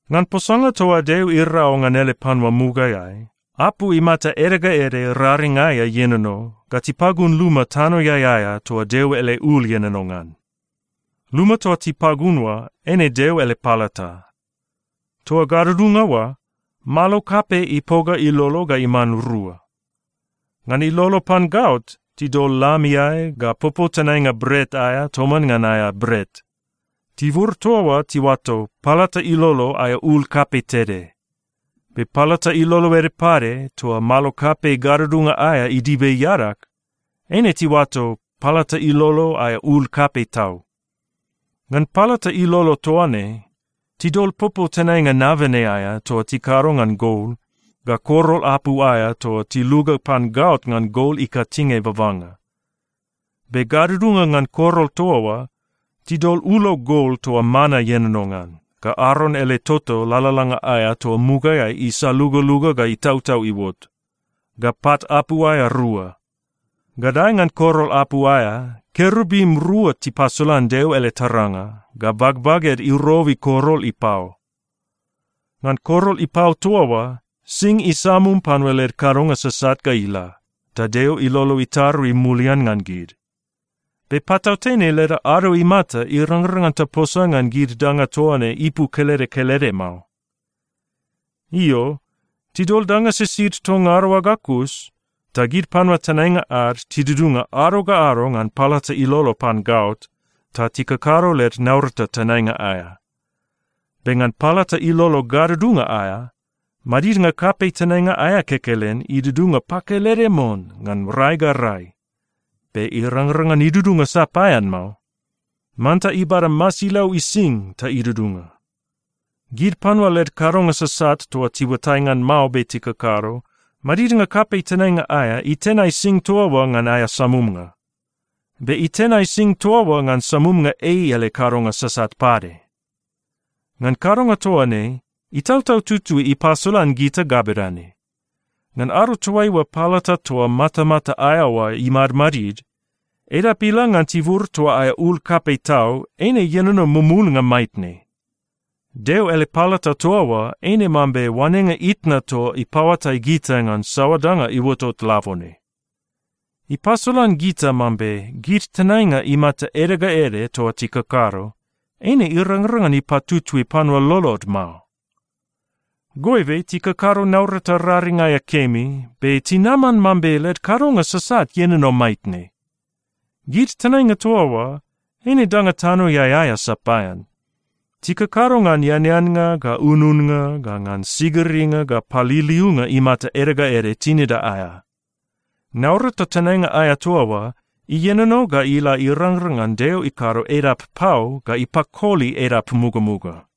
Ngan posanga toa Deo irau ngan ele panua mugaeai, apu imata ede ga ede raring aea ienono, ga tipagun luma tanoeai aea toa Deo ele ul ienono ngan. Luma toa tipagun oa eine Deo ele palata. Toa gadudunga oa, malo kapei ipoga ilolo ga iman rua. Ngan ilolo pan gaot, tidol lam iae ga popou tenainga bret aea toman ngan aea bret. Tibur toa oa tiuato “palata ilolo aea ul kapei tede.” Be palata ilolo ede pade, toa malo kapei gadudunga aea idibe iadag, eine tiuato “palata ilolo aea ul kapei tau.” Ngan palata ilolo toa ne, tidol popou tenainga nabene aea toa tikado ngan gol, ga korol apu aea toa tiluga pan gaot ngan gol ikatinge babanga. Be gadudunga ngan korol toa oa, tidol ulo gol toa mana ienono ngan, ga Aron ele toto lalalanga aea toa mugaeai isalugaluga ga itautau iuot, ga pat apu aea rua. Gadae ngan korol apu aea, kerubim rua tipasolan Deo ele taranga, ga bagbaged irobi korol ipao. Ngan korol ipao toa oa, sing isamum panua led kadonga sasat ga ila, ta Deo ilolo itarui mulian ngan gid. Be patautene leda ado imata irangrang ngan taposa ngan gid danga toa ne ipu kelede kelede mao. Io, tidol danga sisid toa ngada oa ga kus, ta gid panua tenainga ad tidudunga ado ga ado ngan palata ilolo pan gaot, ta tikakado led naurata tenainga aea. Be ngan palata ilolo gadudunga aea, madidnga kapei tenainga aea kekelen idudunga pakelede mon ngan rai ga rai. Be irangrang ngan idudunga sapaean mao. Manta ibada masilau ising ta idudunga. Gid panua led kadonga sasat toa tiuatai ngan mao be tikakado, madidnga kapei tenainga aea itenai sing toa oa ngan aea samumnga. Be itenai sing toa oa ngan samumnga ei ele kadonga sasat pade. Ngan kadonga toa ne, Itautau Tutui ipasolan gita ga bedane: Ngan ado toaiua palata toa matamata aea oa imadmadid, edap ila ngan tibur toa aea ul kapei tau, eine ienono mumulnga maitne. Deo ele palata toa oa eine mambe oanenga itna toa ipaoatai gita ngan saoa danga iuotot labone. Ipasolan gita mambe gid tenainga imata ede ga ede toa tikakado, eine irangrang ngan ipatutui panua lolod mao. Goibe tikakado naurata raring aea kemi, be tinaman mambe led kadonga sasat ienono maitne. Gid tenainga toa oa, eine danga tanoeai aea sapaean. Tikakado ngan eaneannga ga ununnga ga ngan sigiringa ga paliliunga imata ede ga ede tinida aea. Naurata tenainga aea toa oa ienono ga ila irangrang ngan Deo ikado edap pau ga ipakoli edap mugamuga.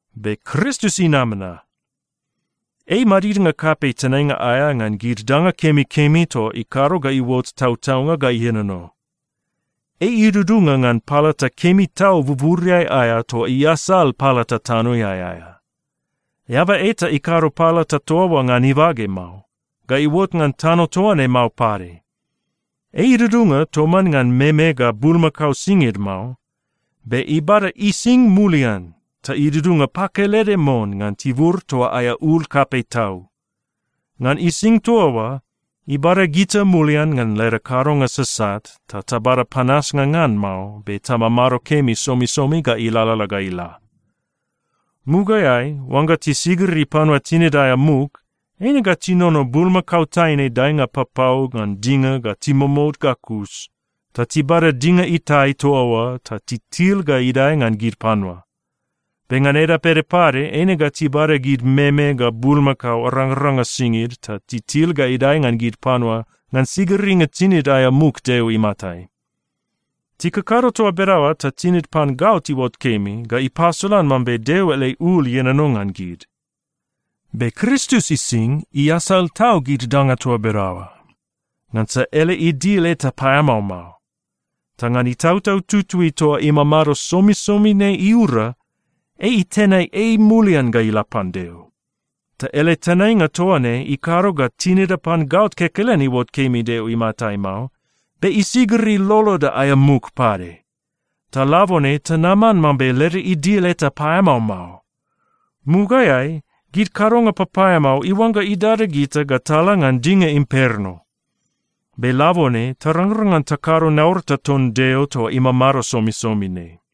Be Kristus inama na. Ei madidnga kapei tenainga aea ngan gid danga kemikemi toa ikado ga iuot tautaunga ga ienono. Ei idudunga ngan palata kemi tau buburiai aea toa iasal palata tanoeai aea. Eaba eta ikado palata toa oa ngan ibage mao, ga iuot ngan tano toa ne mao pade. Ei idudunga toman ngan meme ga bulmakao singid mao, be ibada ising mulian ta idudunga pakelede mon ngan tibur toa aea ul kapei tau. Ngan ising toa oa, ibada gita mulian ngan leda kadonga sasat ta tabada panasnga ngan mao be tamamado kemi somisomi ga ilalala ga ila. Mugaeai oangga tisigiri panua tinid aea muk, eine ga tinono bulmakao taine daenga papau ngan dinga ga timomout ga kus, ta tibada dinga itae toa oa ta titil ga idae ngan gid panua. Be ngan edap ede pade, eine ga tibada gid meme ga bulmakao arangaranga singid ta titil ga idae ngan gid panua ngan sigiringa tinid aea muk Deo imatai. Tikakado toa bedaoa ta tinid pan gaot iuot kemi, ga ipasolan mambe Deo ele ul ienono ngan gid. Be Kristus ising iasal tau gid danga toa bedaoa. Ngansa ele idil eta paeamao mao. Ta ngan Itautau Tutui toa imamado somisomi ne iura, ei itenai ei mulian ga ila pan Deo. Ta ele tenainga toa ne ikado ga tinida pan gaot kekelen iuot kemi Deo imatai mao, be isigiri loloda aea muk pade. Ta labone tanaman mambe leda idil eta paeamao mao. Mugaeai gid kadonga papaeamao iuangga idada gita ga tala ngan dinga imperno, be labone tarangrang ngan takado naurata ton Deo toa imamado somisomi ne.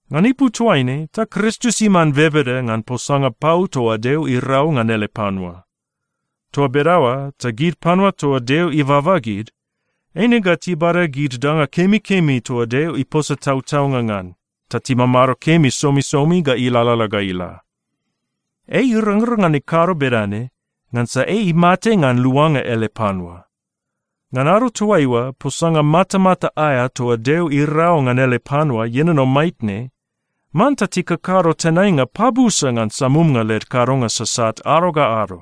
Ngan ipu toaine, ta Kristus iman bebeda ngan posanga pau toa Deo irau ngan ele panua. Toa bedaoa ta gid panua toa Deo ibaba gid, eine ga tibada gid danga kemikemi toa Deo iposa tautaunga ngan ta timamado kemi somisomi ga ilalala ga ila. Ei irangrang ngan ikado bedane ngansa ei imate ngan luanga ele panua. Ngan ado toaiua posanga matamata aea toa Deo irau ngan ele panua ienono maitne, manta tikakado tenainga pabusa ngan samumnga led kadonga sasat ado ga ado.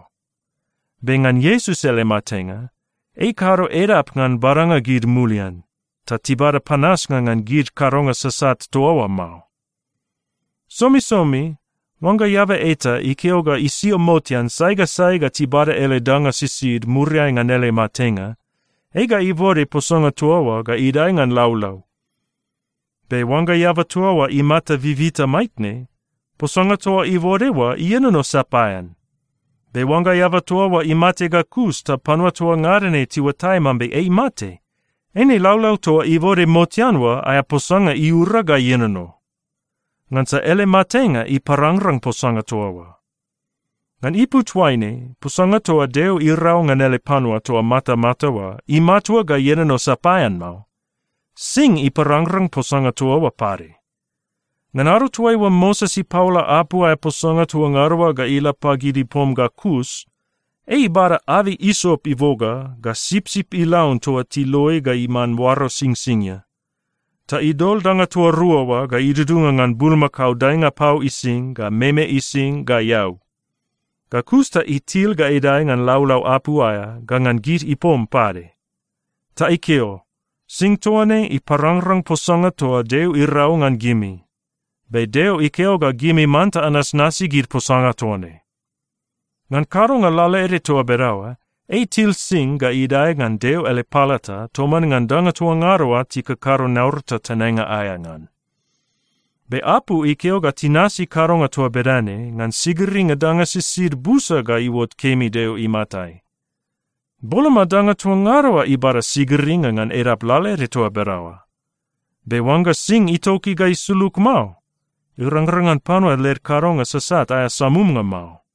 Be ngan Iesus ele matenga, ei ikado edap ngan badanga gid mulian ta tibada panasnga ngan gid kadonga sasat toa oa mao. Somisomi oangga eaba eta ikeo ga isio motean sai ga sai ga tibada ele danga sisid muriai ngan ele matenga, ei ga ibode posanga toa oa ga idae ngan laulau. Be oangga eaba toa oa imata bibita maitne, posanga toa ibode oa ienono sapaean. Be oangga eaba toa oa imate ga kus ta panua toa ngada ne tiuatai mambe ei imate, eine laulau toa ibode motean oa aea posanga iura ga ienono. Ngansa ele matenga iparangrang posanga toa oa. Ngan ipu toaine, posanga toa Deo irau ngan ele panua toa matamata oa, imatua ga ienono sapaean mao. Sing iparangrang posanga toa oa pade. Ngan ado toaiua Moses ipaola apu aea posanga toa ngada oa ga ila pagid ipom ga kus, ei ibada abei isop iboga ga sipsip ilaun toa tiloi ga iman oaro singsingia. Ta idol danga toa rua oa ga idudunga ngan bulmakao daenga pau ising, ga meme ising, ga eau. Ga kus ta itil ga idae ngan laulau apu aea ga ngan gid ipom pade. Ta ikeo, “Sing toa ne iparangrang posanga toa Deo irau ngan gimi, be Deo ikeo ga gimi manta anasnasi gid posanga toa ne.” Ngan kadonga lalaede toa bedaoa, ei itil sing ga idae ngan Deo ele palata toman ngan danga toa ngada oa tikakado naurata tenainga aea ngan. Be apu ikeo ga tinasi kadonga toa bedane ngan sigiringa danga sisid busa ga iuot kemi Deo imatai. Boloma danga toa ngada oa ibada sigiringa ngan edap lalaede toa bedaoa. Be oangga sing itoki ga isulug mao, irangrang ngan panua led kadonga sasat aea samumnga mao.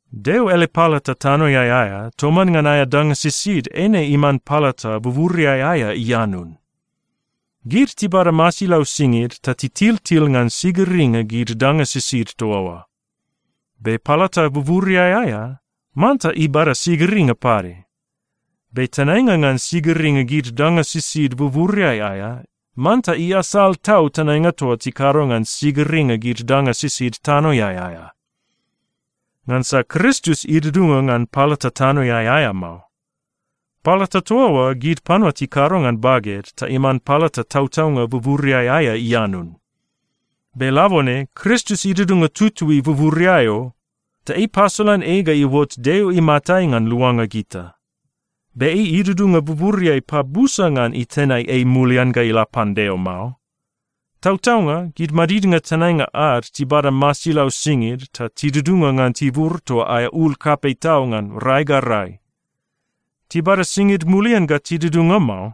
Deo ele palata tanoeai aea toman ngan aea danga sisid, eine iman palata buburiai aea ianun. Gid tibada masilau singid ta titiltil ngan sigiringa gid danga sisid toa oa. Be palata buburiai aea manta ibada sigiringa pade. Be tenainga ngan sigiringa gid danga sisid buburiai aea manta iasal tau tenainga toa tikado ngan sigiringa gid danga sisid tanoeai aea. Ngansa Kristus idudunga ngan palata tanoeai aea mao. Palata toa oa gid panua tikado ngan baged ta iman palata tautaunga buburiai aea ianun. Be labone Kristus idudunga tutui buburiai o. Ta ei ipasolan ei ga iuot Deo imatai ngan luanga gita. Be ei idudunga buburiai pabusa ngan itenai ei mulian ga ila pan Deo mao. Tautaunga, gid madidnga tenainga ad tibada masilau singid ta tidudunga ngan tibur toa aea ul kapei tau ngan rai ga rai. Tibada singid mulian ga tidudunga mao,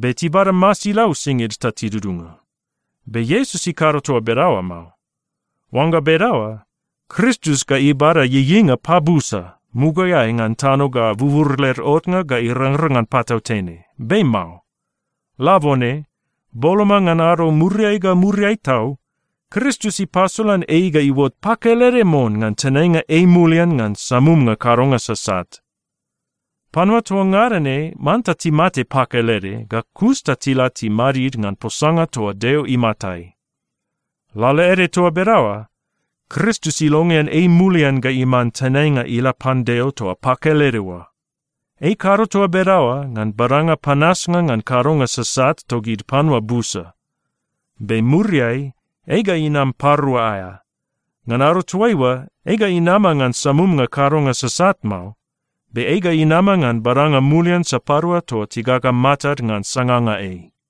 be tibada masilau singid ta tidudunga. Be Iesus ikado toa bedaoa mao. Oangga bedaoa, Kristus ga ibada ieieinga pabusa, mugaeai ngan tano ga bubur led otnga ga irangrang ngan patautene. Be mao. Labone, boloma ngan ado muriai ga muriai tau, Kristus ipasolan ei ga iuot pakelede mon ngan tenainga ei mulian ngan samumnga kadonga sasat. Panua toa ngada ne manta timate pakelede, ga kus ta tila timadid ngan posanga toa Deo imatai. Lalaede toa bedaoa, Kristus ilongean ei mulian ga iman tenainga ila pan Deo toa pakelede oa. Ei ikado toa bedaoa ngan badanga panasnga ngan kadonga sasat togid panua busa. Be muriai, ei ga inam parua aea. Ngan ado toaiua, ei ga inama ngan samumnga kadonga sasat mao, be ei ga inama ngan badanga mulian sapadua toa tigaga matad ngan sanganga ei.